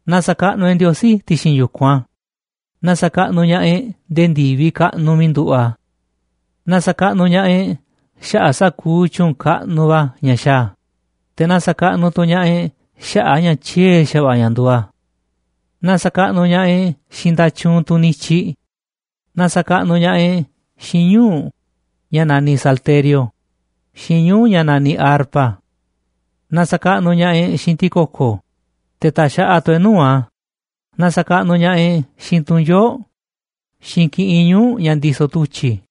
Na sa̱kaꞌnuꞌ e̱ꞌ Ndiosí ti̱xi̱n yu̱kunꞌ a̱. Na sa̱kaꞌnuꞌ ña̱ꞌaꞌ e̱ꞌ nde̱e̱ ndi̱viꞌ kaꞌnuꞌ miiꞌ nduꞌu̱ꞌ a̱. Na sa̱kaꞌnuꞌ ña̱ꞌaꞌ e̱ꞌ xaꞌa̱ꞌ sa̱kuuꞌ tyu̱u̱n kaꞌnuꞌ va̱ ña̱ xaaꞌ a̱. Te̱ na sa̱kaꞌnuꞌ tu̱ ña̱ꞌaꞌ e̱ꞌ xaꞌa̱ꞌ a̱ ña̱ tyiee̱ xa̱va̱ꞌa̱ ña̱ nduuꞌ a̱. Na sa̱kaꞌnuꞌ ña̱ꞌaꞌ e̱ꞌ xiinꞌ nda̱tyuunꞌ tunꞌ nityiꞌ. Na sa̱kaꞌnuꞌ ña̱ꞌaꞌ e̱ꞌ xiinꞌ ñuu̱ꞌ ña̱ naniꞌ salterio xiinꞌ ñuu̱ꞌ ña̱ naniꞌ arpa. Na sa̱kaꞌnuꞌ ña̱ꞌaꞌ e̱ꞌ xiinꞌ ti̱ko̱ko̱, te̱ ta̱xaꞌaꞌ tu̱ e̱ꞌ nuu̱ꞌ a̱. Na sa̱kaꞌnuꞌ ña̱ꞌaꞌ e̱ꞌ xiinꞌ tu̱nyoo̱ꞌ xiinꞌ kiꞌinꞌ ñuu̱ꞌ ña̱ ndisoꞌ tu̱tyi̱.